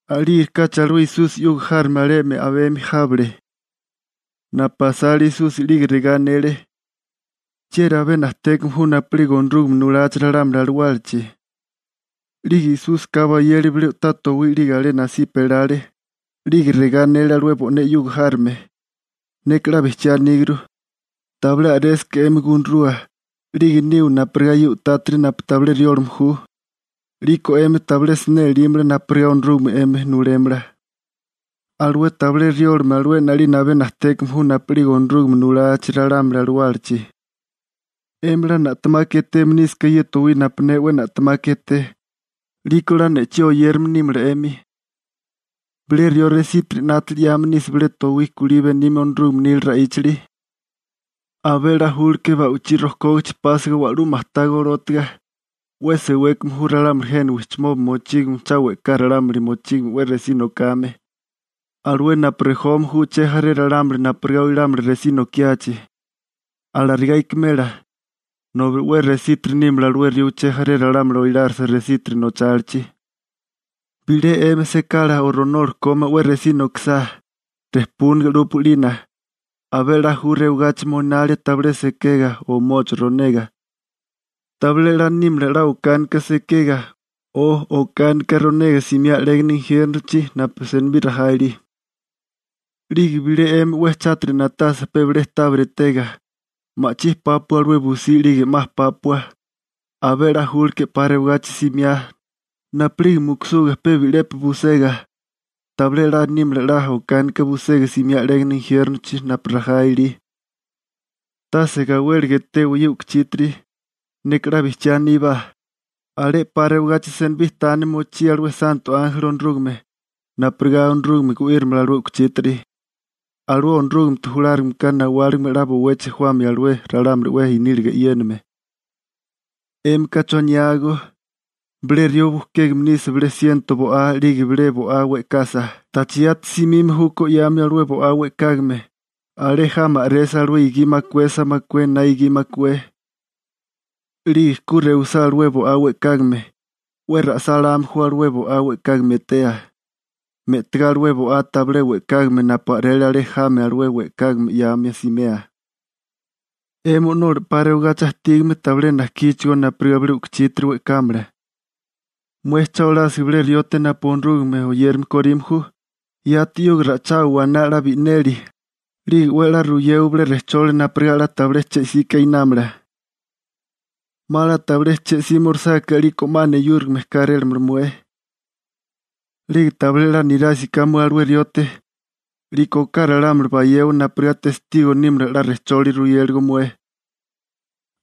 A'lígerikáchi alué Esusi 'yuga járome alemi a'bemi jábale napu asale Esusi 'lige regá anele: ―¿Chieri abé najtékame ju napu'lige Onorúgame nulachi ralámuli alawálachi? 'Lige Esúsika bayele bilé u'tá towí 'lige alé nasipa elale, 'lige regá anele alué bo'né 'yuga járome: ―Neka 'la bijchiá aníguru. Tabilé a'résaká 'emi gunarua, 'lige niwa napurigá ye u'tátiri napu tabilé riólame ju, 'liko 'emi tabilé siné elímala napurigá Onorúgame 'emi nulémala. Alué tabilé riólame alué 'nalina abé najtékame ju napu'lige Onorúgame nulachi ralámuli alawálachi. 'Emi 'la na'temaka eteme nísaká ye towí napu ne 'we na'temaka eté, 'liko 'la ne'chí oyérame nímala 'emi. › Bilé rió resítiri 'nátili 'yame bilé ta towí kulí benime Onorúgame nila ra'íchali, abé 'la nímala ba'ichí rojkógachi pásiga wa'lú majtá golótiga. ¡'We sewékame ju ralámuli jena wijchimoba mochígame cha we'ká ralámuli mochígame 'we resí nokame, alué napu rejome ju uché jaré ralámuli napurigá oilámala resí nokiachi! ¡Alarigá ikimela, nobi 'we resítiri nímala alué rió uché jaré ralámuli oilárisa resítiri nochálichi! › Bilé 'emi sekala o ronola kómá 'we resí nokisá, rejpúnaga 'lúpua 'lina. Abé a'lá ju rewagachi moinalia tpe bi'lepi sekega o pe bi'lepi ronega. Tabilé 'la nímala 'la okánika sekega, o okánika ronega simiá 'légana injiérnochi napu senibí rajá ilí. 'Lige bilé 'emi 'we chátiri na'tasa pe bilé tábiri etega, ma'chí pápua alué busí 'lige 'ma pápua, abé 'la nímala 'pa rewagachi simiá, napu'lige mukusuga pe bi'lepi busega. Tabilé 'la nímala 'la okánika busega simiá 'légana injiérnochi napu rajá ilí. › Tase gawéliga etewa ye u'kuchítiri. Neka 'la bijchiá aní, alé 'pa rewagachi senibí tani mochí alué santo ánjeli Onorúgame, napurigá Onorúgame gu'írimala alué u'kuchítiri. Alué Onorúgamete julárigameka nawáligime 'la bowechi jawamia alué ralámuli 'we i'níliga e'yéname. › ¿'Émika choniágó? Bilé rió bujkégame nisa bilé siento bo'á 'lige bilé bo'á we'kasa, ¿tacha yati simime júkó 'yamia alué bo'á we'kágame, alé jami a'resa alué gi makuesa makué na gi makué? 'Lige ku rewisá alué bo'á we'kágame, 'we ra'sáláme ju alué bo'á we'kágame etea, me'tigá alué bo'á tabilé we'kágame napu a'rele alé jami alué we'kágame 'yamia simea. 'Emi o'nola 'pa rewagachi ajtígame tabilé najkíchigó napurigá bilé u'kuchítiri we'kámala. › Mué cha olásiga bilé riote napu Onorúgame oyérame korime ju, yati 'yuga ra'ichawa waná 'la bi'neli, 'lige 'we a'lá ruyewa bilé rejcholi napurigá 'la tabilé che 'sika inámala. 'Ma 'la tabilé che 'símorisáká 'liko 'ma neyúrigame kérélamala mué. 'Lige tabilé 'la nirásiká mué alué riote, 'liko oká ralámuli bayewa napurigá testigo nímala 'la rejcholi ruyéligo mué.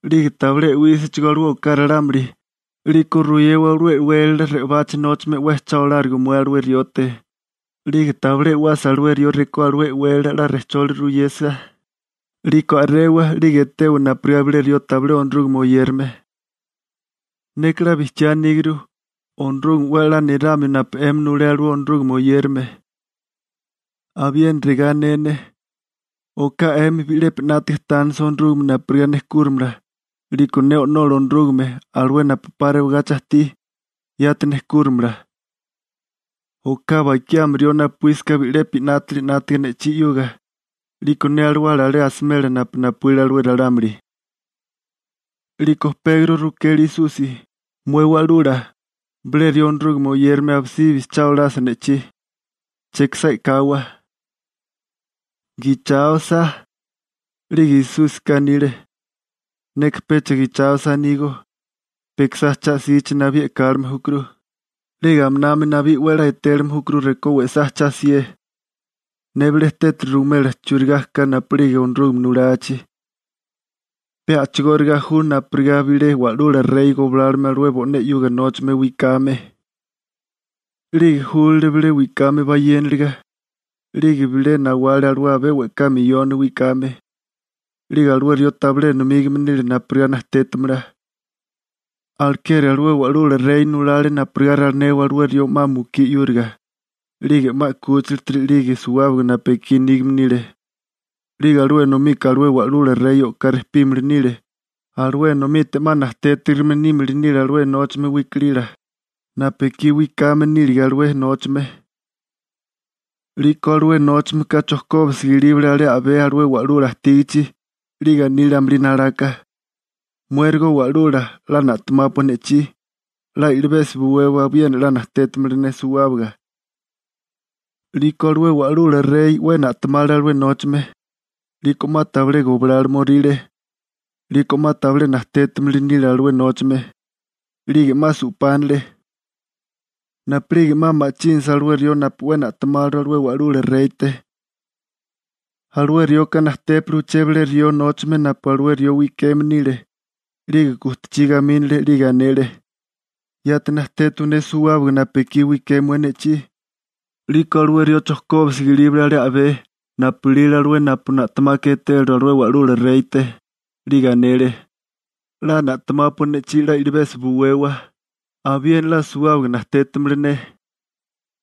'Lige tabilé e'wísachigó alué oká ralámuli, 'liko ruyewa alué e'wélala re'obachi nóchame 'we cha olárigo mué alué riote, 'lige tabilé e'wasa alué rió rekó alué e'wélala 'la rejcholi ruyesa, 'liko a'rewa 'lige etewa napurigá bilé rió tabilé Onorúgame oyérame. › Neka 'la bijchiá aníguru, Onorúgame 'we a'lá niramio napu 'emi nulé alué Onorúgame oyérame. › Abiena regá ané ne, oká 'emi bi'lepi 'nátaga tánisa Onorúgame napurigá nejkúramala, 'liko ne O'nola Onorúgame, alué napu 'pa rewagachi ajtí, yati nejkúramala. Oká bakiami rió napuísaká bi'lepi 'nátili 'nátaga ne'chí 'yuga, 'liko ne alawala alé asimela napu napuíle alué ralámuli. 'Liko Pegro rukele Esusi: ―Mué Wa'lula, bilé rió Onorúgame oyérame abisibi cha olasa ne'chí, ¿chekisá e'kawa? ¿Gicháosa? 'Lige Esúsika anile: ―Neka pecha gicháosa anígó. Pe ikisá cha'sichi nabí e'kálime júkuru, 'lige aminami nabí 'we a'lá etélime júkuru rekó we'sá cha'sié. › Ne bilé tétali ruwimela churigá ka napu'lige Onorúgame nulachi. Pe a'chigóriga ju napurigá bilé wa'lula rey goblálile alué bo'né 'yuga nóchame wikame. 'Lige júlale bilé wikame bayéniliga, 'lige bilé nawale alué abé we'ká miyoni wikame, 'lige alué rió tabilé enomígame nile napurigá najtétamala. Alekeri alué wa'lula rey nulale napurigá ralinewa alué rió 'ma mukí 'yúriga, 'lige 'ma 'kúchilatiri 'lige suwábaga napu ekí nígame nile. 'Lige alué enomika alué wa'lula rey o'ká rejpímili nile, alué enomite 'ma najtétirigime nímili nile alué nóchame wikalila, napu ekí wikame nílige alué nóchame. 'Liko alué nóchameka chojkóbisiga ilíbale alé a'bé alué wa'lula ajtígichi, 'lige anile amulí nalaka: «Muérigo wa'lula 'la na'temápua ne'chí, 'la i'libesi buwewa abiena 'la najtétamala ne suwábaga.» 'Liko alué wa'lula rey 'we na'tamale alué nóchame, 'liko 'ma tabilé goblálomoríle, 'liko 'ma tabilé najtétimili nile alué nóchame. 'Lige 'ma su'pánale. Napu'lige 'ma ma'chínasa alué rió napu 'we na'temáliru alué wa'lula reyte, alué rioka najtépale uché bilé rió nóchame napu alué rió wikeme nile 'lige gujtachí gamínale 'lige anele: «¡Yati najtétawa ne suwábaga napu ekí wiké mué ne'chí!» 'Liko alué rió chojkóbisiga ilíbale alé a'bé napu ilile alué napu na'temaka etéliru alué wa'lula reyte, 'lige anele: «'La na'temápua ne'chí 'la i'libesi buwewa, abiena 'la suwábaga najtétamala ne.»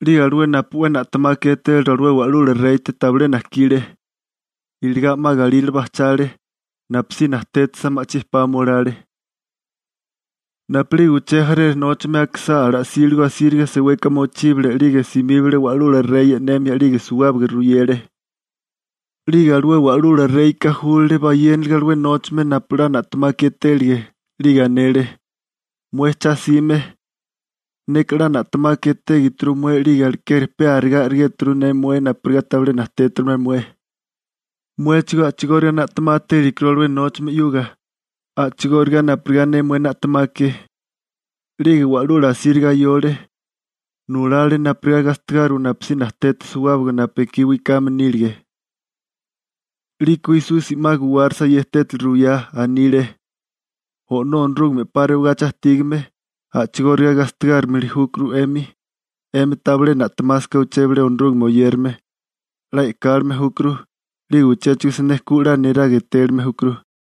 'Lige alué napu 'we na'temaka etéliru alué wa'lula reyte tabilé najkile, iligá 'ma galírale bajchale, napusí najtétasa ma'chí pame olale. Napu'lige uché jaré nóchame akisá ala'síligo asíriga seweka mochíbale 'lige simíbale wa'lula rey e'nemia, 'lige suwábaga ruyele. 'Lige alué wa'lula reyka júlale bayéniliga alué nóchame napu 'la na'temaka etélige 'lige anele: «Mué cha'sime, neka 'la na'temaka etégituru mué 'lige, alekeri pe arigá a'rigéturu ne napurigá tabilé najtétimala mué. Muéchigó a'chigóriga na'temá télikuru alué nóchame 'yuga, a'chigóriga napurigá ne mué na'temake.» 'Lige wa'lula asíriga ayole. Nulale napurigá gastigáriwa napusí najteta suwábaga napu ekí wikame nílige. 'Liko Esusi 'ma guwárasa ye tétali ruwiyá, anile: ―O'nó Onorúgame 'pa rewagachi ajtígame, a'chigóriga gastigárimili júkuru 'emi, 'emi tabilé na'temásaká uché bilé Onorúgame oyérame. 'La e'kálime júkuru, 'lige uchéchigo siné ku 'la neraga etélime júkuru.